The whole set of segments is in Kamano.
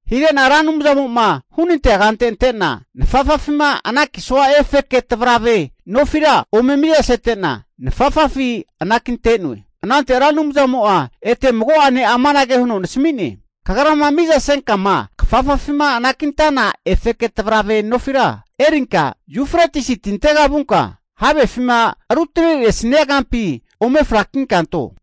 Hige'na Ra Anumzamo'ma hunantea kante ante'na, nafafafima anakisua efeke tavarave nofira ome mizasete'na nafafafi anakinte'noe. Anante Ra Anumzamo'a ete mago'ene amanage huno nasami'ne. Kagrama mizasenka'ma kafafafima anakintana efeke tavarave nofira erinka, Yufretisi tintega vunka havefima rutane'nesania kampi ome frakinka anto.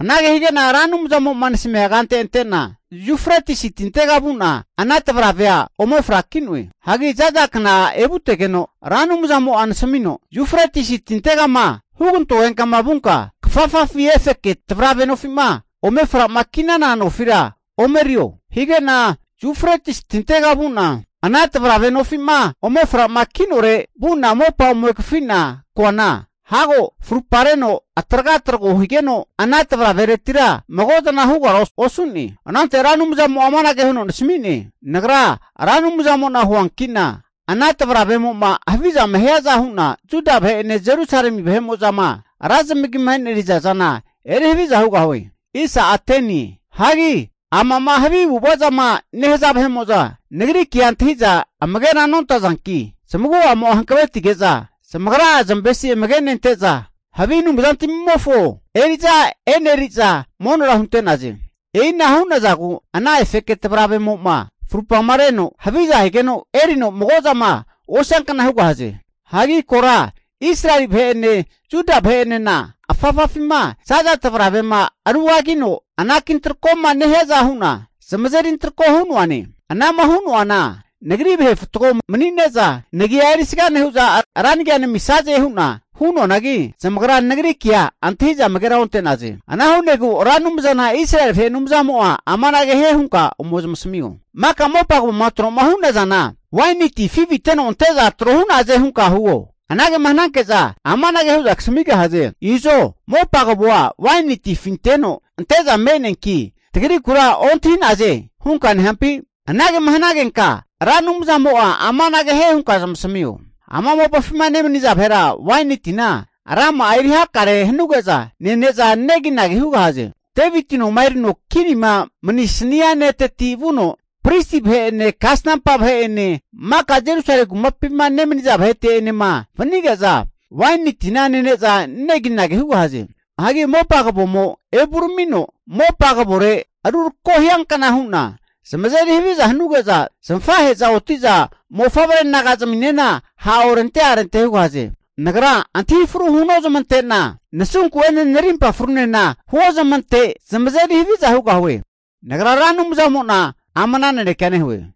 Anage hige'na Ra Anumzamo'ma nasamia kante ante'na, Yufretisi tintega vu'na, ana tavaravea ome fraki'noe. Hagi za'za kna evutegeno, Ra Anumzamo'a nasamino, Yufretisi tintegama hugantogenka'ma vunka, kafafafi efeke tavarave nofi'ma ome fra'ma ki'nana nofira ome erio. Hige'na Yufretisi tintega vu'na ana tavarave nofi'ma ome fra'ma ki'nore vu'na mopa ome kafi'na koana, hago frupareno atraga trago higeno ana tavaraveretira mago zana hugara osu'ne. Anante Ra Anumzamo'a amanage huno nasami'ne. Nagra Ra Anumzamo'na huanki'na, ana tavaravemo'ma havizama hiaza hu'na, Juda vahe'ene Jerusalemi vahe mo'zanema ra zamagima e'neriza zana eri haviza hugahue. Hagi amama havi avu'ava zama nehaza vahe'mo'za Nagri kea antahi'za amagera nontazanki, zamagu'amo'a hankavetige'za zamagra'a zamavesi amage'nente'za, havi anumzantamimofo eri'za eneriza monora hunte'naze. E'ina hu'nazagu ana efeke tavaravemo'ma farupareno haviza higeno erino mago zama osiankna hugahaze. Hagi kora Israeli vahe'ene Juda vahe'enena, afafafima zaza tavravema rugagino anaki antrako'ma nehiaza hu'na, zamazeri antrako hu'noane. Ana'ma hu'noana Nagri vahe fatgo manine'za nagia erisga nehu'za, ra nagia namisaze hu'na hu'noanagi zamagra Nagri kea antahi'za amagera onte'naze. Ana hu'negu Ra Anumzana Israeli vahe Anumzamo'a amanage hie hunka ome zamasamio. Maka mopa kavoma tro'ma hu'nazana, waini ti afiviteno ante'za tro hu'naze hunka huo. Anagema hananke'za amanage hu'za kasamigahaze. Izo mopa kavoa waini ti afinteno ante'za me'neanki, tagrikura ontahi'naze hunka nehampi? Anagema hanagenka, Ra Anumzamo'a amanage hie hunka zamasamio. Ama mopafima nemaniza vahera waini tina rama'a eri hakare hanuge'za nene'za neginagi hugahaze. Deviti noma erino kinima manisania ne'teti vuno, pristi vahe'ene kasnampa vahe'ene maka Jerusalemi kumapima nemaniza vahete'enema vanige'za waini tina nene'za neginagi hugahaze. Hagi mopa kavomo evuramino mopa kavore rurako hiankna hu'na zamazeri haviza hanuge'za, zamafahe'za oti'za mofavre naga zaminena ha' orente arente hugahaze. Nagra antahi fru huno zamante'na, nasunku'ene narimpa frunena huozamante zamazeri haviza hugahue. Nagra Ra Anumzamo'na amana nanekea nehue.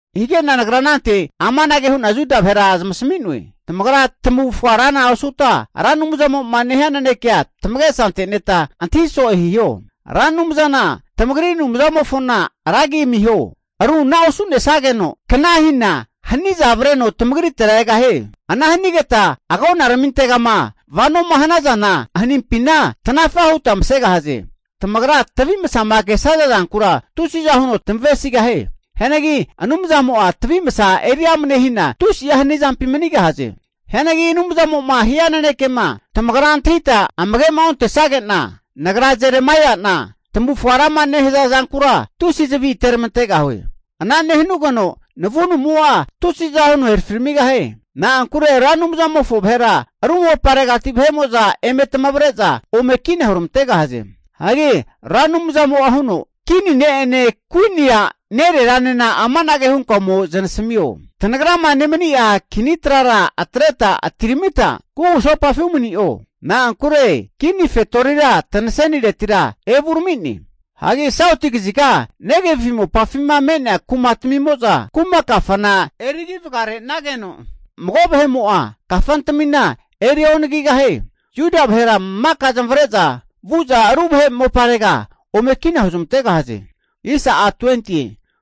Hige'na nagra anante amanage hu'na Juda vahera zamasami'noe. Tamagra tamufga rana osuta Ra Anumzamo'ma nehia nanekea tamagesa ante'neta antahi so'e hiho. Ra Anumzana tamagri Anumzamofona ra agi amiho. Ru ana osu'nesageno kna hina haniza avreno tamagritera egahie. Ana hanigeta agonaramintegama vanoma hanazana hanimpina tanafa huta masegahaze. Tamagra tavi masama kesaza zankura tusiza huno tamavesigahie. Hianagi Anumzamo'a tavi masa eri amne hina tusi hanizampi manigahaze. Hianagi Anumzamo'ma hia nanekema tamagra antahita amage'ma ontesage'na, nagra Jeremaia'na tamavufga rama nehaza zankura tusi zavi ateramantegahue. Ana nehanugeno navunumo'a tusiza huno herafiramigahie. Na'ankure Ra Anumzamofo vahera ru moparegati vahe'mo'za eme tamavre'za ome kina huramantegahaze. Hagi Ra Anumzamo'a huno, kini ne'ene kuini a' nereranena amanage hunka ome zanasamio. Tanagrama nemani'a Kini trara atreta utiramita kugusopafi umani'o. Na'ankure kini fetorira tanaseniretira evurami'ne. Hagi sauti kaziga Negevi mopafima me'nea kuma tamimo'za kuma kafana erigi vagare'nageno, mago vahe'mo'a kafantamina eri onagigahie. Juda vahera maka zamavare'za vu'za ru vahe moparega ome kina huzmantegahaze.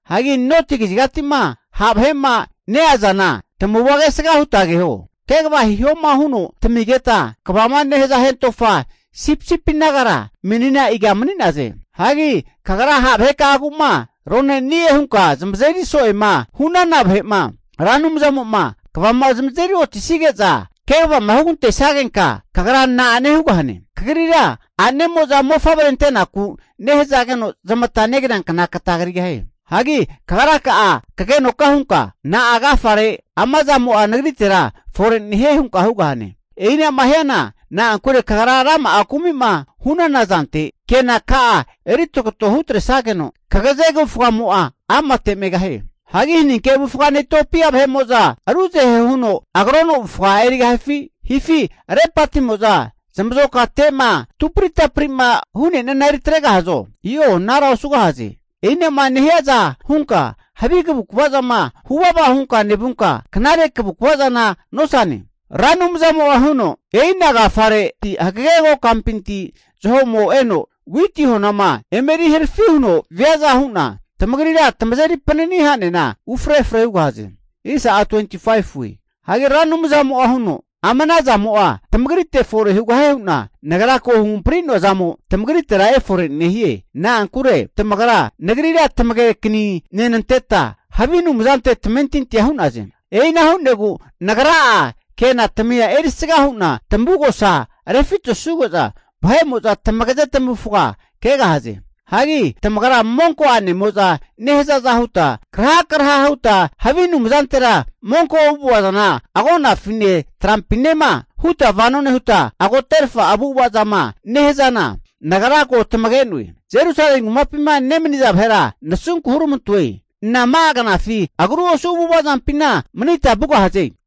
Hagi noti kazigati'ma ha' vahe'ma neazana tamavua kesga huta keho. Kegava hihoma huno tamigeta kegavama nehaza hentofa sipisipi nagara menina iga mani'naze? Hagi kagra ha' vahekagu'ma roneni'e hunka zamazeri so'ema hu'nana vahe'ma, Ra Anumzamo'ma kvama zamazeri otisige'za kegavama hugantesagenka, kagra na'ane hugahane? Kagrira a'nemo'za mofavre antenaku nehazageno zamata negriankna kata krigahie. Hagi kagraka'a kagenoka hunka, Na'a agafare ama zamo'a nagritera fore nehie? hunka hugahane. E'ina'ma hiana na'ankure kagra rama'a kumi'ma hu'nana zante, kenaka'a eri tagato hutresageno kagaze kavufgamo'a amate megahie. Hagi haninke avufgane Itiopia vahe'mo'za ruzahera huno agrono avufga erigahifi? Hifi lepatimo'za zamazokate'ma tupritapri'ma hu'neana eritregahazo? I'o anara osugahaze. E'inama nehiaza hunka havi kavukvazana huvava hunka nevunka, knare kavukava zana nosane. Ra Anumzamo'a huno, e'ina agafare hagege kokampinti zaho'mo eno witi honama eme eri harafi huno viaza hu'na tamagrira tamazeri panani ha'nena ufre efre hugahaze. Hagi Ra Anumzamo'a huno, Ama ana zamo'a tamagrite fore hugahie hu'na Nagra ko huhampari'noa zamo tamagritera efore nehie. Na'ankure tamagra Nagrira tamagekani nenanteta havi anumzante tamentintia hu'naze. E'ina hu'negu Nagra'a kenatamia erisga hu'na tamavugosa rufitesuge'za, vahe'mo'za tamagaze zamavufaga kegahaze. Hagi tamagra monko a'nemo'za nehazaza huta krahakraha huta havi anumzantera monko avu'ava zana agonafine trampinema huta vano nehuta agoterfa avu'ava zama nehazana Nagra ko tamage'noe. Jerusalemi kumapima nemaniza vahera nasunku huramantoe, nama'a knafi agru osu avu'avazampina manita vugahaze?